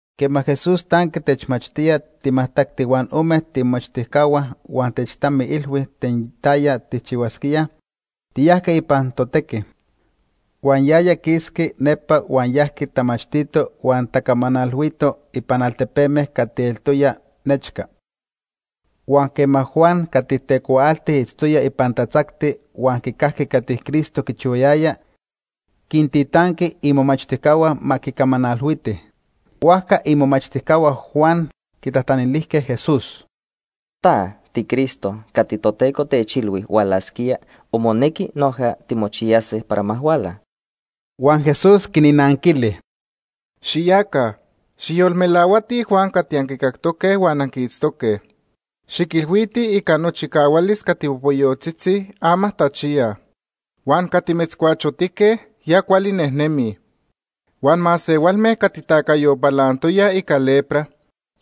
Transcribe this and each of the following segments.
Quema Jesús tanqui techmachtía timajtacti huan ome tiimomachtijcahua huan techtamiilhui ten taya tijchihuasquíaj, tiyajque ipan totequi. Huan yaya quisqui nepa huan yajqui tamachtito huan tacamanalhuito ipan altepeme cati eltoyaj nechca. Huan quema Juan cati tecuaalti itztoya ipan tatzacti huan quicajqui cati Cristo quichihuayaya, quintitanqui imomachtijcahua ma quicamanalhuitij. Huajca imomachtijcahua Juan quitajtanilijque Jesús: ―¿Ta tiCristo cati Toteco techilhui hualasquía o monequi noja timochiyase para ma huala? Huan Jesús quinnanquili: “Xiyaca, xijyolmelahuatij Juan cati anquicactoque huan anquiitztoque. Xiquilhuitij, ica nochicahualis cati popoyotzitzi, ama tachiyaj. Huan cati metzcuachotique, ya cuali nejnemij. Huan masehualme cati tacayo palantoyaj ica lepra,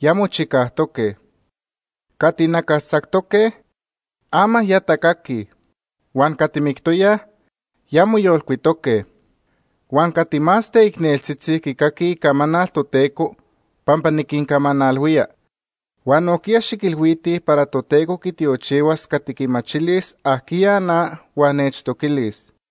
ya mochicajtoque. Cati nacastzactoque, ama ya tacaquij huan cati mictoyaj, ya moyolcuitoque huan cati más teicneltzitzi quicaquij icamanal Toteco pampa niquincamanalhuía. Huan nojquiya xiquilhuitij para Toteco quitiochihuas cati quimachilis ajquiya na huan nechtoquilis.”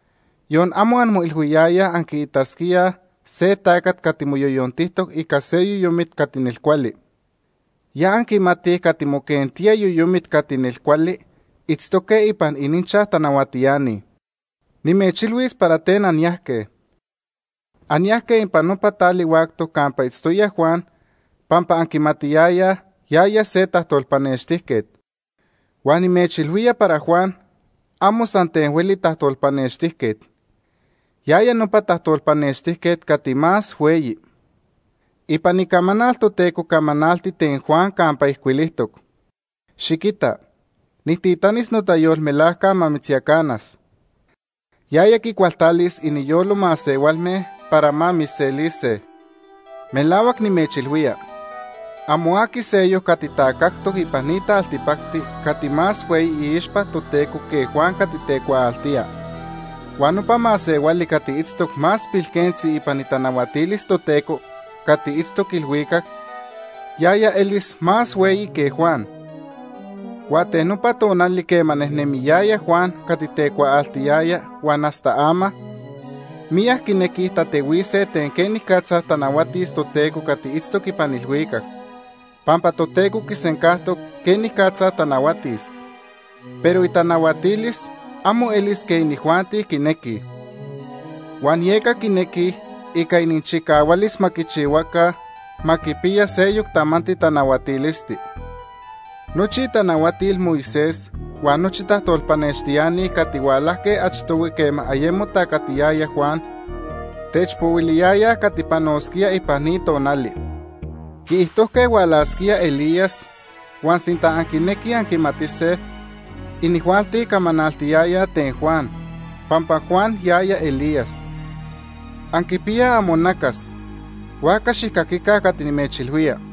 Yon amo anmoilhuiyayaj anquiitasquíaj se tacat cati moyoyontijtoc ica se yoyomit cati nelcuali. Ya anquimatij cati moquentíaj yoyomit cati nelcuali itztoque ipan ininchaj tanahuatiani. Nimechilhuis para ten anyajque. Anyajque ipan nopa tali huactoc campa itztoya Juan pampa anquimatiyayaj yaya se tajtolpanextijquet. Huan nimechilhuía para Juan amo san ten hueli tajtolpanextijquet. Yaya nopa tajtolpanextijquet cati más hueyi. Ipan Icamanal Toteco camanalti ten Juan campa ijcuilijtoc: ‘Xiquita, nijtitanis notayolmelajca ma mitzyacanas. Yaya quicualtalis iniyolo masehualme para ma mitzselise.’ Melahuac nimechilhuía, amo aqui seyoc cati tacajtoc ipan ni taltipacti cati más hueyi iixpa Toteco que Juan cati tecuaaltía. Huan nopa masehuali cati itztoc más pilquentzi ipan itanahuatilis Toteco cati itztoc ilhuicac, yaya elis más hueyi que Juan. “Huan ten nopa tonali quema nejnemiyaya Juan cati tecuaaltiyaya huan hasta ama, miyac quinequij tatehuise ten quenicatza tanahuatis Toteco cati itztoc ipan ilhuicac, pampa Toteco quisencajtoc quenicatza tanahuatis, pero itanahuatilis amo elis quej inijuanti quinequij. Huan yeca quinequij ica ininchicahualis ma quichihuaca ma quipiya seyoc tamanti tanahuatilisti. Nochi itanahuatil Moisés huan nochi tajtolpanextiani cati hualajque achtohui quema ayemo tacatiyaya Juan, techpohuiliyayaj cati panosquía ipan ni tonali. Quiijtojque hualasquía se Elías, huan sinta anquinequij anquimatise, inijuanti camanaltiyayaj ten Juan, pampa Juan yaya Elías. Anquipiyaj amonacas, huajca xijcaquica cati nimechilhuía.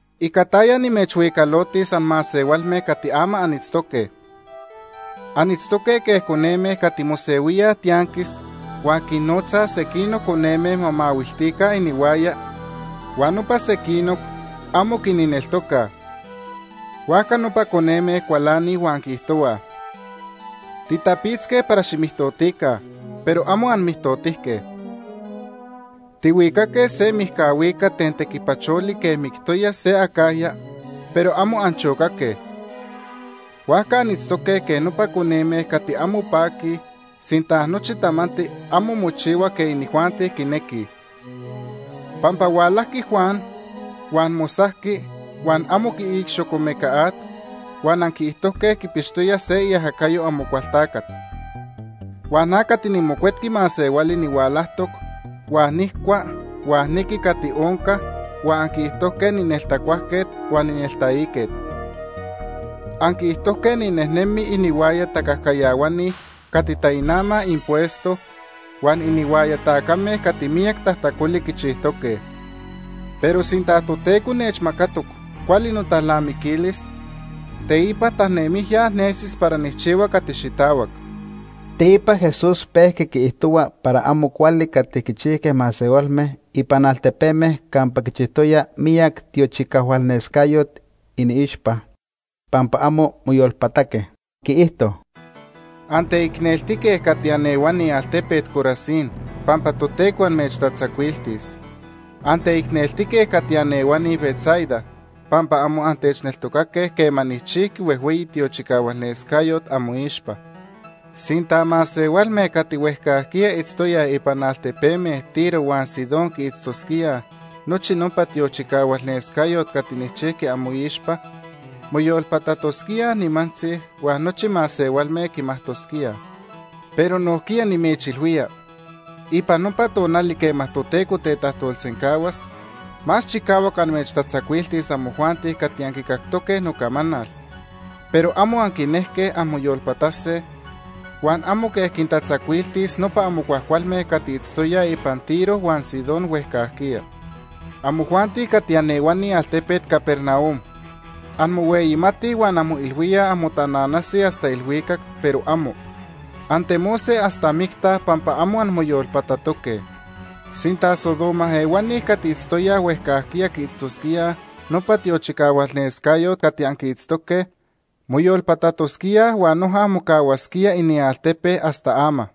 “¿Ica taya nimechhuicalotis anmasehualme cati ama anitztoque? Anitztoque quej coneme cati mosehuíaj tianquis huan quinnotzaj sequinoc coneme ma mahuiltica inihuaya huan nopa sequinoc amo quinneltocaj. Huajca nopa coneme cualanij huan quiijtohuaj: ‘Titapitzque para ximijtotica, pero amo anmijtotijque. Tihuicaque se mijca huicat ten tequipacholi quej mictoya se acajya, pero amo anchocaque.’ Huajca anitztoque quej nopa coneme cati amo paquij sinta nochi tamanti amo mochihua quej inijuanti quinequij. Pampa hualajqui Juan huan mosajqui huan amo quiic xocomeca at huan anquiijtojque quipixtoya se iajacayo Amocualtacat. Huan na cati niMocuetqui Masehuali nihualajtoc, huan nijcua huan niqui cati onca huan anquiijtojque nineltacuajquet huan nineltaiquet. Anquiijtojque ninejnemi inihuaya tacajcayahuani cati tainamaj impuesto huan inihuaya tacame cati miyac tajtacoli quichijtoque. Pero sinta Toteco nechmacatoc cuali notalnamiquilis, teipa tanemijya nesis para nijchihua cati xitahuac.” Teipa Jesús pejqui quiijtohua para amo cuali cati quichijque masehualme ipan altepeme campa quichijtoya miyac tiochicahualnescayot iniixpa, pampa amo moyolpataque. Quiijto: “Anteicneltique cati anehuani altepet Corazín pampa Toteco amechtatzacuiltis. Anteicneltique cati anehuani Betsaida, pampa amo antechneltocaque quema nijchijqui huejhueyi tiochicahualnescayot amoixpa. Sinta masehualme cati huejcajquiya itztoyaj ipan altepeme Tiro huan Sidón quiitztosquíaj nochi nopa tiochicahualnescayot cati nijchijqui amoixpa, moyolpatatosquíaj nimantzi huan nochi masehualme quimajtosquíaj. Pero nojquiya nimechilhuía, ipan nopa tonali quema Toteco tetajtolsencahuas, más chicahuac amechtatzacuiltis amojuanti cati anquicactoque nocamanal, pero amo anquinejque anmoyolpatase, huan amo quej quintatzacuiltis nopa amo cuajcualme cati itztoyaj ipan Tiro huan Sidón huejcajquiya. Amojuanti cati anehuani altepet Capernaum, anmohueyimatij huan anmoilhuíaj anmotananase hasta ilhuicac, pero amo. Antemose hasta micta pampa amo anmoyolpatatoque. Sinta Sodoma ehuani cati itztoyaj huejcajquiya quiitztosquíaj nopa tiochicahualnescayot cati anquiitztoque, moyolpatatosquíaj huan noja mocahuasquía inialtepe hasta ama.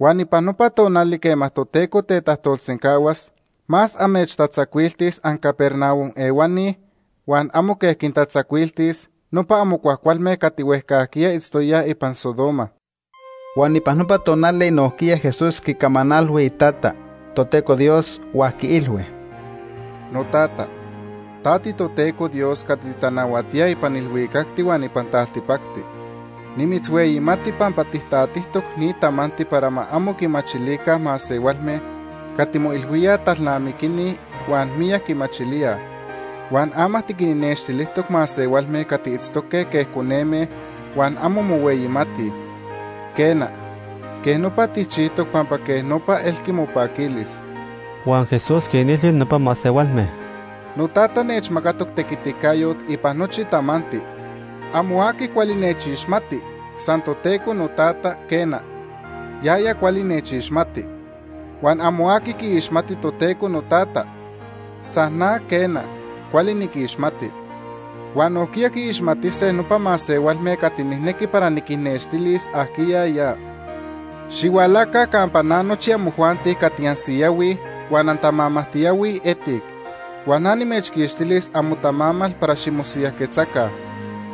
Huan ipan nopa tonali quema Toteco tetajtolsencahuas, más amechtatzacuiltis anCapernaum ehuani huan amo quej quintatzacuiltis nopa amo cuajcualme cati huejcajquiya itztoyaj ipan Sodoma.” Huan ipan nopa tonali nojquiya Jesús quicamanalhui Itata, Toteco Dios, huan quiilhui: “Notata, ta tiToteco Dios cati titanahuatía ipan ilhuicacti huan ipan taltipacti. Nimitzhueyimati pampa tijtatijtoc ni tamanti para ma amo quimachilica masehualme cati moilhuíaj talnamiquini huan miyac quimachilíaj. Huan ama tiquinnextilijtoc masehualme cati itztoque quej coneme huan amo mohueyimatij. Quena, quej nopa tijchijtoc pampa quej nopa elqui mopaquilis.” Huan Jesús quinilhui nopa masehualme: “NoTata nechmacatoc tequiticayot ipan nochi tamanti. Amo aqui cuali nechixmati, san Toteco noTata, quena, yaya cuali nechixmati. Huan amo aqui quiixmati Toteco noTata, san na, quena, cuali niquixmati. Huan nojquiya quiixmatise nopa masehualme cati nijnequi para niquinnextilis ajquiya ya. Xihualaca campa na nochi amojuanti cati ansiyahuij huan antamamajtiyahuij etic, huan na nimechquixtilis amotamamal para ximosiyajquetzaca.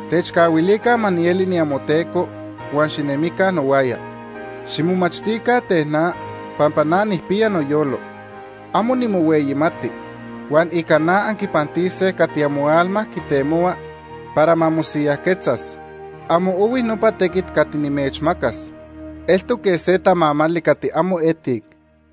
Techcahuilica ma nieli niamoTeco huan xinemica nohuaya. Ximomachtica ten na, pampa na nijpiya noyolo. Amo nimohueyimati huan ica na anquipantise cati amoalma quitemohua para ma mosiyajquetzas. Amo ohui nopa tequit cati nimechmacas. Eltoc quej se tamamali cati amo etic.”